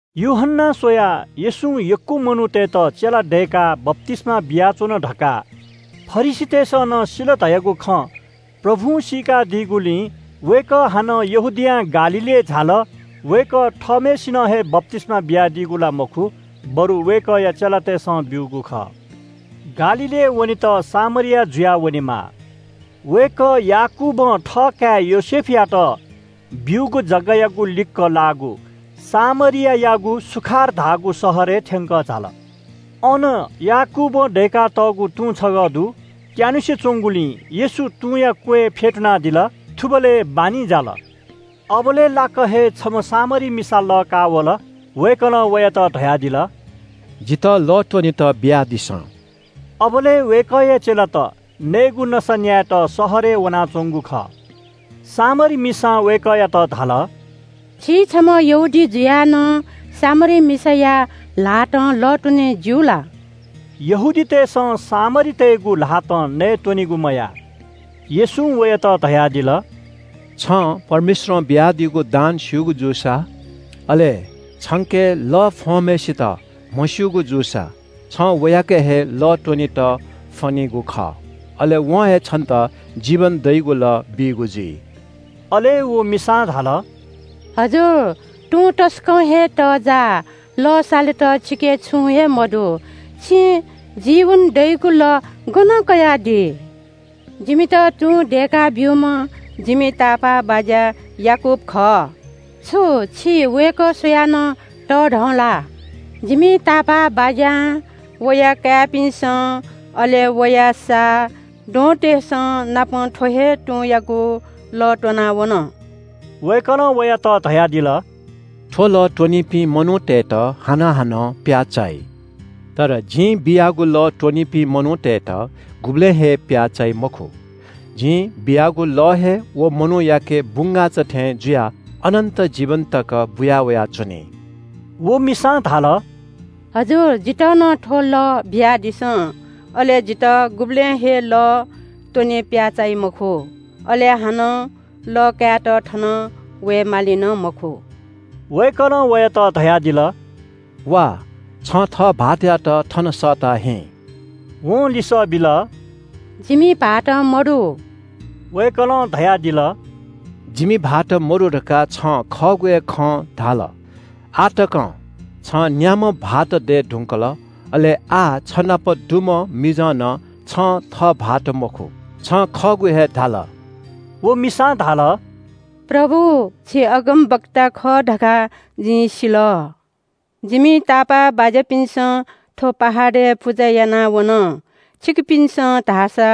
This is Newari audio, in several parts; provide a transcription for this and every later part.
यूहन्‍नां स्‍वयाः येशूं यक्‍व मनूतय्‌त चेला दय्‌काः बप्‍तिस्‍मा बियाच्‍वन धकाः फरिसीतय्‌सं नं सिल धयागु खँ प्रभुं सीकादीगुलिं वय्‌कः हानं यहूदियां गालीलय् झाल। वय्‌कः थःम्‍हय्‌सिनं हे बप्‍तिस्‍मा बियादीगु ला मखु, बरु वय्‌कःया चेलातय्‌सं ब्‍यूगु खः। गालीलय् वनेत सामरिया जुयाः वनेमाः। वय्‌कः याकूबं थःकाय् योसेफयात ब्‍यूगु जगायागु लिक्‍क लाःगु सामरियायागु सुखार धाःगु शहरय् थ्‍यंकः झाल। अन याकूबं दय्‌कातःगु तुं छगः दु। त्‍यानुसे च्‍वंगुलिं येशू तुंया क्‍वय् फ्‍यतुनादिल। थुबलय् बान्‍हि जाल। अबलय् लाक्‍क हे छम्‍ह सामरी मिसा लः काःवल। वय्‌कलं वयात धयादिल – “जितः लः त्‍वनेत बियादिसँ।” अबलय् वय्‌कःया चेलात नयेगु नसा न्‍यायेत शहरय् वनाच्‍वंगु खः। सामरी मिसां वय्‌कःयात धाल – “छि छम्‍ह यहूदी जुयाः नं सामरी मिसाया ल्‍हातं लः त्‍वने ज्‍यू ला?” यहूदीतय्‌सं सामरीतय्‌गु ल्‍हातं नयेत्‍वनेगु मयाः। येशूं वयात धयादिल – “छं परमेश्‍वरं बियादीगु दान स्‍यूगु जूसा, अले छंके लः फ्‍वंम्‍हय्‌सित म्‍हस्‍यूगु जूसा, छं वयाके हे लः त्‍वनेत फ्‍वनीगु जुइ। अले वं हे छन्‍त जीवन दइगु लः बीगु जुइ।” अले व मिसां धाल – “हजुर, तुं तसकं हे तःजाः, लः सालेत छिके छुं हे मदु। छिं जीवन दइगु लः गनं कयादी? जिमित तुं दय्‌काब्‍यूम्‍ह जिमि तापाःबाज्‍या याकूब खः। छु छि वय्‌कः स्‍वयाः नं तःधं ला? जिमि तापाःबाज्‍यां, वया काय्‌पिन्‍सं, अले वया सा, द्वहंतय्‌संनापं थ्‍व हे तुंयागु लः त्‍वना वन।” वय्‌कलं वयात धयादिल – “थ्‍व लः त्‍वनीपिं मनूतय्‌त हानं हानं प्‍याः चाइ। तर जिं बियागु लः त्‍वनीपिं मनूतय्‌त गुबलें हे प्‍याः चाइ मखु। जिं बियागु लः हे व मनूयाके बुंगाःचा थें जुयाः अनन्‍त जीवन तक बुयावया च्‍वनी।” व मिसां धाल – “हजुर, जितः नं थ्‍व लः बियादिसँ। अले जितः गुबलें हे लः त्‍वने प्‍याः चाइ मखु। अले हानं लः कायेत थन वये माली नं मखु।” वय्‌कलं वयात धयादिल – “वा, छं थः भाःतयात थन सःता हिँ।” वं लिसः बिल – “जिमि भाःत मदु।” वय्‌कलं धयादिल – “जिमि भाःत मदु धकाः छं खःगु हे खँ धाल। आः तकं छं न्‍याम्‍ह भाःत दये धुंकल, अले आः छनापं दुम्‍ह मिजं नं छं थः भाःत मखु। छं खःगु हे धाल।” व मिसां धाल – “प्रभु, छि अगमवक्ता खः धकाः जिं सिल। जिमि तापाःबाज्‍यापिन्‍सं थ्‍व पहाडय् पुजा याना वन, छिकपिन्‍सं धाःसा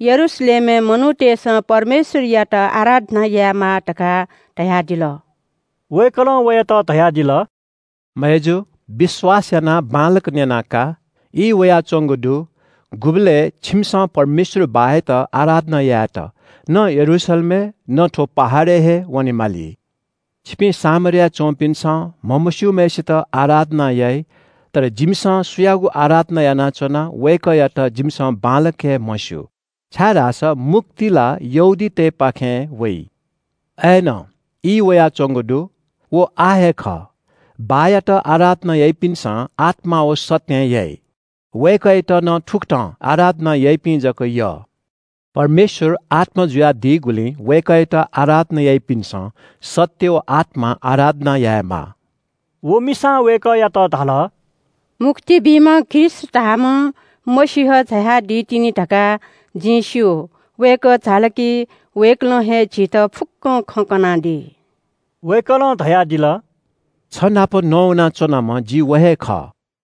यरूशलेमय् मनूतय्‌सं परमेश्‍वरयात आराधना यायेमाः धकाः धयादिल।” वय्‌कलं वयात धयादिल – “मय्‌जु, विश्‍वास यानाः बांलाक न्‍यना का। ई वयाच्‍वंगु दु, गुबलय् छिमिसं परमेश्‍वर बाःयात आराधना यायेत न यरूशलेमय् न थ्‍व पहाडय् हे वनेमाली। छिपिं सामरियाय् च्‍वंपिन्‍सं म्‍हमस्‍यूम्‍हय्‌सित आराधना याइ। तर जिमिसं सुयागु आराधना यानाच्‍वना वय्‌कःयात जिमिसं बांलाक हे म्‍हस्‍यू, छाय्‌धाःसा मुक्ति ला यहूदीतय्‌पाखें वइ। अय्‌नं ई वयाच्‍वंगु दु, व आः हे खः, बाःयात आराधना याइपिन्‍सं आत्‍मां व सत्‍यं याइ। वय्‌कःयात नं थुकथं आराधना याइपिं जक यः। परमेश्‍वर आत्‍मा जुयादीगुलिं वय्‌कःयात आराधना याइपिन्‍सं सत्‍य व आत्‍मां आराधना यायेमाः।” व मिसां वय्‌कःयात धाल – “मुक्ति बीम्‍ह ख्रीष्‍ट धाःम्‍ह मसीह झायादी तिनि धकाः जिं स्‍यू। वय्‌कः झाल कि वय्‌कलं हे झीत फुक्‍कं खँ कनादी।” वय्‌कलं धयादिल – “छनापं नवाना च्‍वनाम्‍ह जि, व हे खः।”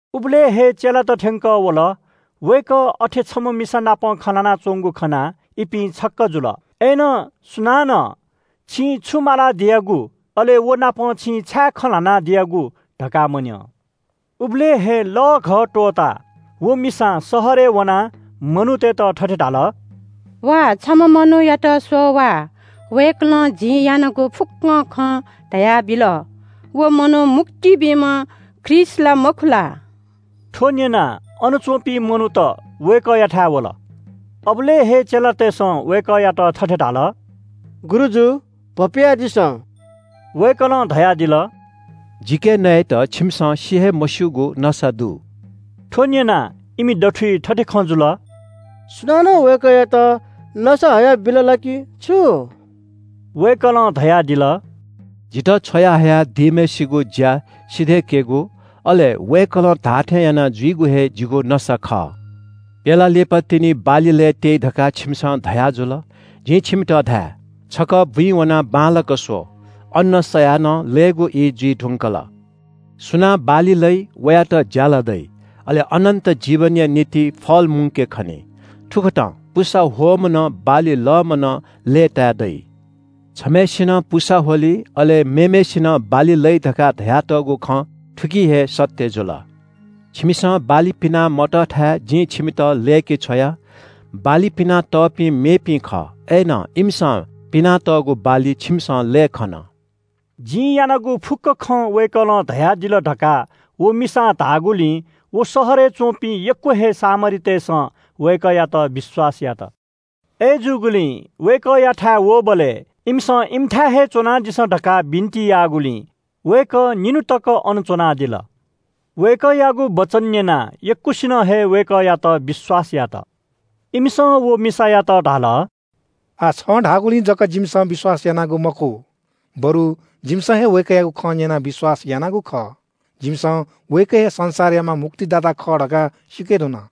उबलय् हे चेलात थ्‍यंकः वल। वय्‌कः अथे छम्‍ह मिसानाप खँ ल्‍हानाच्‍वंगु खनाः इपिं छक्‍क जुल। अय्‌नं सुनानं – “छिं छु मालादियागु” अले “व नाप छिं छाय् खँ ल्‍हानादियागु?” धकाः मन्‍यं। उबलय् हे लःघः त्‍वःताः व मिसां शहरय् वनाः मनूतय्‌त थथे धाल – “वा, छम्‍ह मनूयात स्‍वः वा। वय्‌कलं जिं यानागु फुक्‍क खँ धयाबिल। व मनू मुक्ति बीम्‍ह ख्रीष्‍ट ला, मखु ला?” थ्‍व न्‍यनाः अनच्‍वंपिं मनूत वय्‌कःयाथाय् वल। अबलय् हे चेलातय्‌सं वय्‌कःयात थथे धाल – “गुरुजु, भपियादिसँ।” वय्‌कलं धयादिल – “जिके नयेत छिमिसं सि हे मस्‍यूगु नसा दु।” थ्‍व न्‍यनाः इमि दथुइ थथे खँ जुल – “सुनानं वय्‌कःयात नसा हयाबिल ला कि छु?” वय्‌कलं धयादिल – “जितः छ्वयाहया दीम्‍हय्‌सिगु ज्‍या सिधय्‌केगु, अले वय्‌कलं धाःथें यानाजुइगु हे जिगु नसा खः। ‘प्‍यला लिपातिनि बाली लये त्‍यइ’ धकाः छिमिसं धयाजुल। जिं छिमित धाये – ‘छकः बुँइ वनाः बांलाक स्‍व, अन्‍न सयाः नं लयेगु ई जुइ धुंकल।’ सुनां बाली लइ, वयात ज्‍याला दइ, अले अनन्‍त जीवनया निंतिं फल मुंके खनी। थुकथं पुसा ह्वःम्‍ह नं, बाली लःम्‍ह नं लय्‌ताय् दइ। छम्‍हय्‌सिनं पुसा ह्वली, अले मेम्‍हय्‌सिनं बाली लइ धकाः धयातःगु खँ थुकिं हे सत्‍य जुल। छिमिसं बाली पिना मतःथाय् जिं छिमित लय्‌के छ्वया। बाली पिना तःपिं मेपिं खः, अय्‌नं इमिसं पिनातःगु बाली छिमिसं लये खन।” “जिं यानागु फुक्‍क खँ वय्‌कलं धयादिल” धकाः व मिसां धाःगुलिं व शहरय् च्‍वंपिं यक्‍व हे सामरीतय्‌सं वय्‌कःयात विश्‍वास यात। अय्‌जूगुलिं वय्‌कःयाथाय् वःबलय् इमिसं इमिथाय् हे च्‍वनादिसँ धकाः बिन्‍ति याःगुलिं वय्‌कः निन्‍हु तक अन च्‍वनादिल। वय्‌कःयागु वचन न्‍यनाः यक्‍वसिनं हे वय्‌कःयात विश्‍वास यात। इमिसं व मिसायात धाल – “आः छं धाःगुलिं जक जिमिसं विश्‍वास यानागु मखु, बरु जिमिसं हे वय्‌कःयागु खँ न्‍यनाः विश्‍वास यानागु खः। जिमिसं वय्‌कः हे संसारयाम्‍ह मुक्तिदाता खः धकाः सीके धुन।”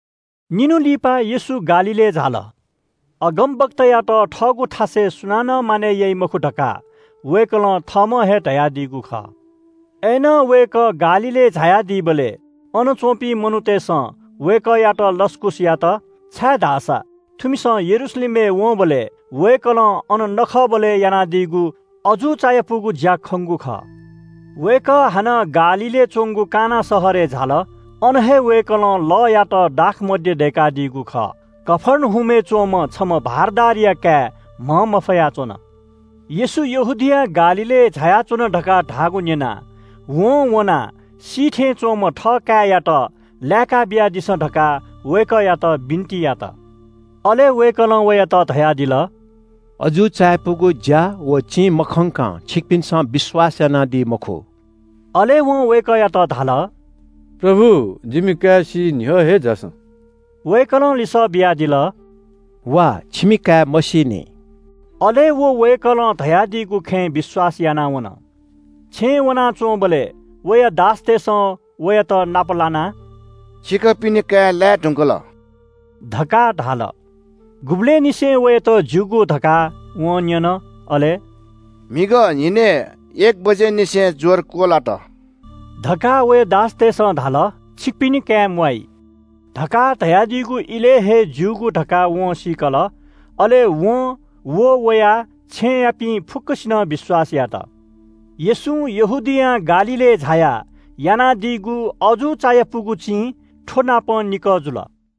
निन्‍हु लिपा येशू गालीलय् झाल। अगमवक्तायात थःगु थासय् सुनानं मानय् याइ मखु धकाः वय्‌कलं थःम्‍हं हे धयादीगु खः। अय्‌नं वय्‌कः गालीलय् झायादीबलय् अन च्‍वंपिं मनूतय्‌सं वय्‌कःयात लसकुस यात, छाय्‌धाःसा थुमिसं यरूशलेमय् वंबलय् वय्‌कलं अन नखःबलय् यानादीगु अजू चायापुगु ज्‍या खंगु खः। वय्‌कः हानं गालीलय् च्‍वंगु काना शहरय् झाल। अन हे वय्‌कलं लःयात दाखमद्य दय्‌कादीगु खः। कफर्नहुमय् च्‍वंम्‍ह छम्‍ह भारदारया काय् म्‍हंमफया च्‍वन। येशू यहूदियां गालीलय् झायाच्‍वन धकाः धाःगु न्‍यनाः वं वनाः सी थें च्‍वंम्‍ह थःकाय्‌यात लाय्‌का बियादिसँ धकाः वय्‌कःयात बिन्‍ति यात। अले वय्‌कलं वयात धयादिल – “अजू चायापुगु ज्‍या व चिं मखंकं छिकपिन्‍सं विश्‍वास यानादी मखु।” अले वं वय्‌कःयात धाल – “प्रभु, जिमि काय् सी न्‍ह्यः हे झासँ।” वय्‌कलं लिसः बियादिल – “हुँ, छिमि काय् मसीनि।” अले व वय्‌कलं धयादीगु खँय् विश्‍वास यानाः वन। छेँय् वनाच्‍वंबलय् वया दासतय्‌सं वयात नाप लानाः “छिकपिनि काय् लाये धुंकल” धकाः धाल। गुबलय् निसें वयात ज्‍यूगु धकाः वं न्‍यन। अले “म्‍हिगः न्‍हिनय् एक बजेनिसें ज्‍वर क्‍वलात” धकाः वया दासतय्‌सं धाल। “छिकपिनि काय् म्‍वाइ” धकाः धयादीगु इलय् हे ज्‍यूगु धकाः वं सीकल। अले वं व वया छेँयापिं फुक्‍कसिनं विश्‍वास यात। येशू यहूदियां गालीलय् झायाः यानादीगु अजू चायापुगु चिं थ्‍वनापं निकः जुल।